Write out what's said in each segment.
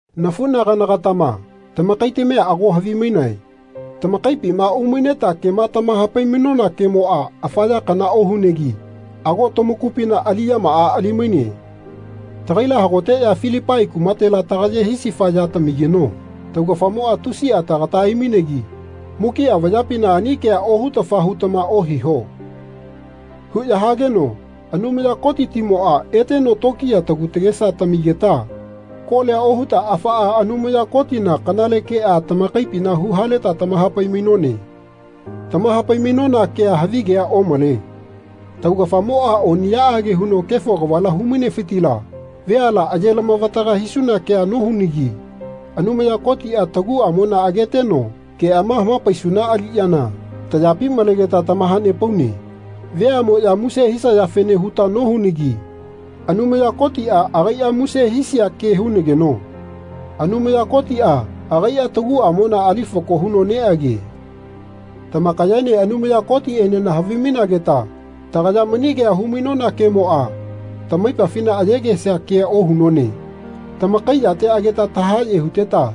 Nafunagana-gatama tamakaitamia ago havimainae, tamakaipima umaineta kema tamahapai-mainona kemoa afa ya kana ohunegi ago tamakupina aliyamaa ali-maine. Tagaila hagoteya Filipai kumatela tagaye hisifa ya tamigeno taugafamoa tusia tagata aimainegi Mukia vayapina ani kea ohutafa hutama ohiho. huya hageno Anumaya Kotitimoa eteno tokiya tagu tagesa tamigeta kolia ohuta afaa Anumaya Kotina kanale kea tamakaipina huhaleta tamahapai-mainone. Tamahapai-mainona kea havigea omale. Taugafamoa oniyaage huno kefo kavala humainefitila veala aye-lamavataga hisuna kea nohunagi Anumaya Kotia taguamona ageteno keama hamapaisuna aliyana tayapi malegeta tamahanepaune. Veamoya muse hisayafene huta nohunagi Anumaya Kotia agaia muse hisia ke hunageno Anumaya Kotia agaia taguamona ali fako huno neage. Tamakayaene Anumaya Kotienena havimainageta tagaya mani kea humainona kemoa tamaipafina ayegesia kea ohunone. Tamakai yate ageta tahaye huteta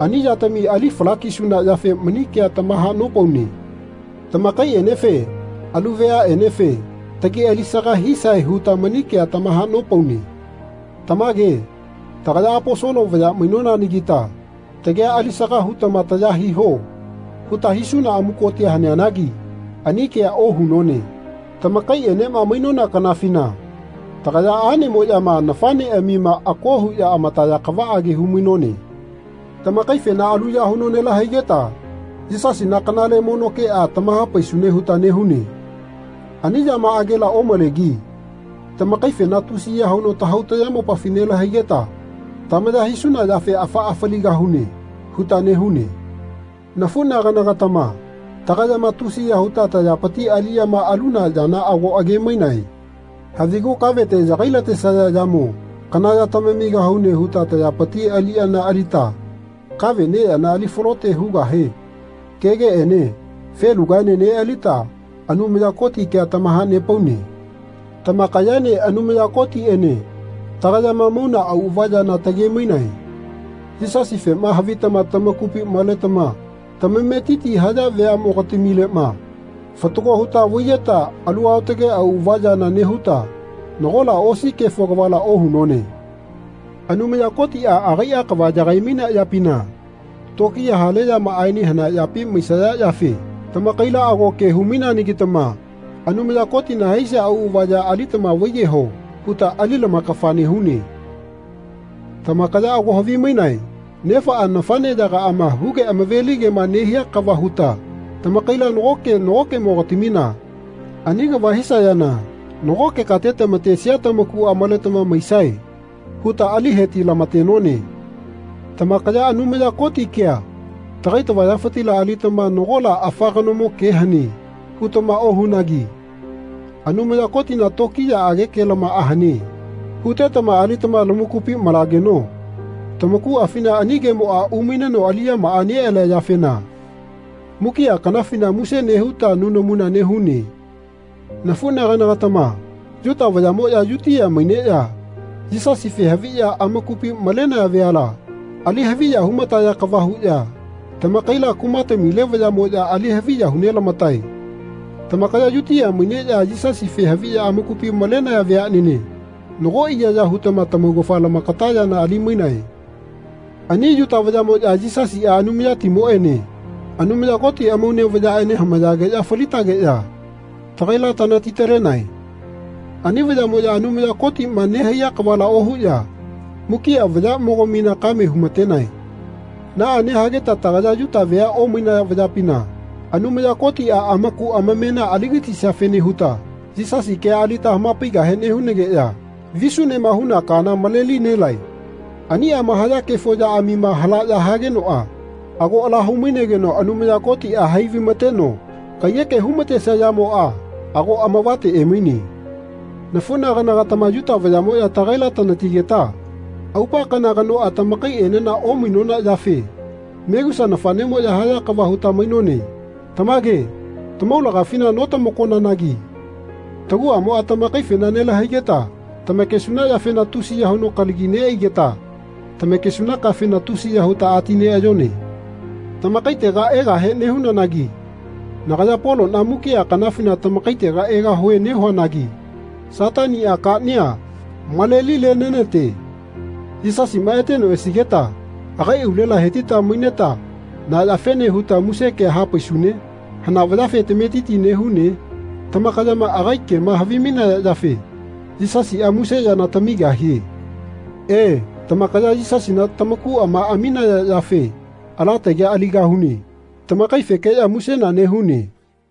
ani yatami ali fala-kisuna yafe mani kea tamahanopaune. Tamakaienefe alu veanenefe tagi alisaga hisae huta mani kea tamahanopaune. Tamage tagaya Aposolo vaya mainonanagita Tagia alisaga hutama taya hiho. huta hisuna amukotia haneanagi ani kea ohunone Tamakaienema mainona kanafina tagaya anemoyama nafaneamima ako huya amataya kavaage hu-mainone. Tamakaifena aluya huno nelahaigeta Yisasina kanale mono kea tamahapaisune huta nehune. Ani yamaagela omalegi tamakaifena tusiya huno tahau tayamopafi nelahaigeta tamaya hisuna yafe Afaa faligahune. huta nehune. Nafunagana-gatama tagayama tusiya huta tayapiti aliyama aluna yana ago age-mainae. Havigu kavete yagai-latesaya yamo kana ya tamamigahune huta tayapitila aliyana alita kave neyana alifalote hugahe kegeene felugaene nealita Anumaya Koti kea tamahanepaune. Tamakayaene Anumaya Kotiene tagayama mauna auava yana tage-mainae. Yisasifema havitama tamakupi maletama tamametiti haya veamogatamilema fatago huta vaiyeta alu aotage auava yama nehuta nagola osi kefo kavala ohunone. Anumaya Kotia agaia kava yagai-mainea yapina tokiya hale yamaaene hanea yapi maisaya yafe tamakaila ago ke hu-maineanagitama Anumaya Kotina haisia auava ya alitama vaiyeho. huta ali lamakafa nehune. Tamakaya ago havimainae, nefaa nafaneyagaama huge amave-ligema nehia kava huta tamakaila nagoke nagokemogatamina ani kava hisayana nagoke kate tamatesia tamakua maletama maisae huta ali heti-lamatenone. Tamakaya Anumaya Koti kea tagai tavayafitila alitama Nagola afa kanomo ke hane. hutama ohunagi Anumaya Kotina tokiyaage kelamaa hane. hutetama alitama lamakupi malageno tamakuafina ani kemoa umaineno aliyamaa nealia yafena mukia kanafina muse nehuta nunamuna nehune. Nafunagana-gatama Yuta vayamoya Yutia maineya Yisasife haviya amakupi malenaya veala ali haviya humataya kava huya tamakaila kumatamile vayayamoya ali haviya hu nelamatae. Tamakaya Yutia maineya Yisasife haviya amakupi malenaya veanene nago iyaya hutama tamaugafa lamakata yana ali-mainae. Ani Yuta vayamoya Yisasia Anumayatimoene Anumaya Koti amaune vayaene hamayageya falitageya tagaila tanati-talenae. Ani vayamoya Anumaya Kotima nehaiya kavala ohuya mukia vayamogamina kame humatenae. Naa nehageta tagaya Yuta vea omainaya vayapina Anumaya Kotia amaku amamena aligatisiafene huta Yisasi kea alita hamapaigahe nehunageya visunema huna kaana maleli nelae. Aniama haya kefo yaamima halaya hagenoa ago ala hu-mainegeno Anumaya Kotia hai vaimateno kaiyeke humatesia yamoa ago amavate emaine. Nafunagana-gatama Yuta vayamoya tagaila tanatigeta aupa kana kanoa tamakaienena omainona yafe megusa nafanemoya haya kava huta mainone. Tamage tamaulagafina notamakonanagi taguamoa tamakaifena nelahaigeta tamakesuna yafena tusiya huno kalagi neaigeta tamakesuna kafena tusiya huta ati neayone. Tamakaitega egahe nehunanagi nagaya Polona mukia kanafina tamakaitega egahue nehuanagi Satania kania malelile nenate. Yisasima eteno esigeta agai aulela hetita maineta na yafene huta muse kea hapaisune? Hana vayafe tametiti nehune? Tamakayama agai kema havimainaya yafe Yisasia muse yana tamigahie. He tamakaya Yisasina tamakuama aminaya yafe ala tagia aligahune. Tamakaifekeya musena nehune.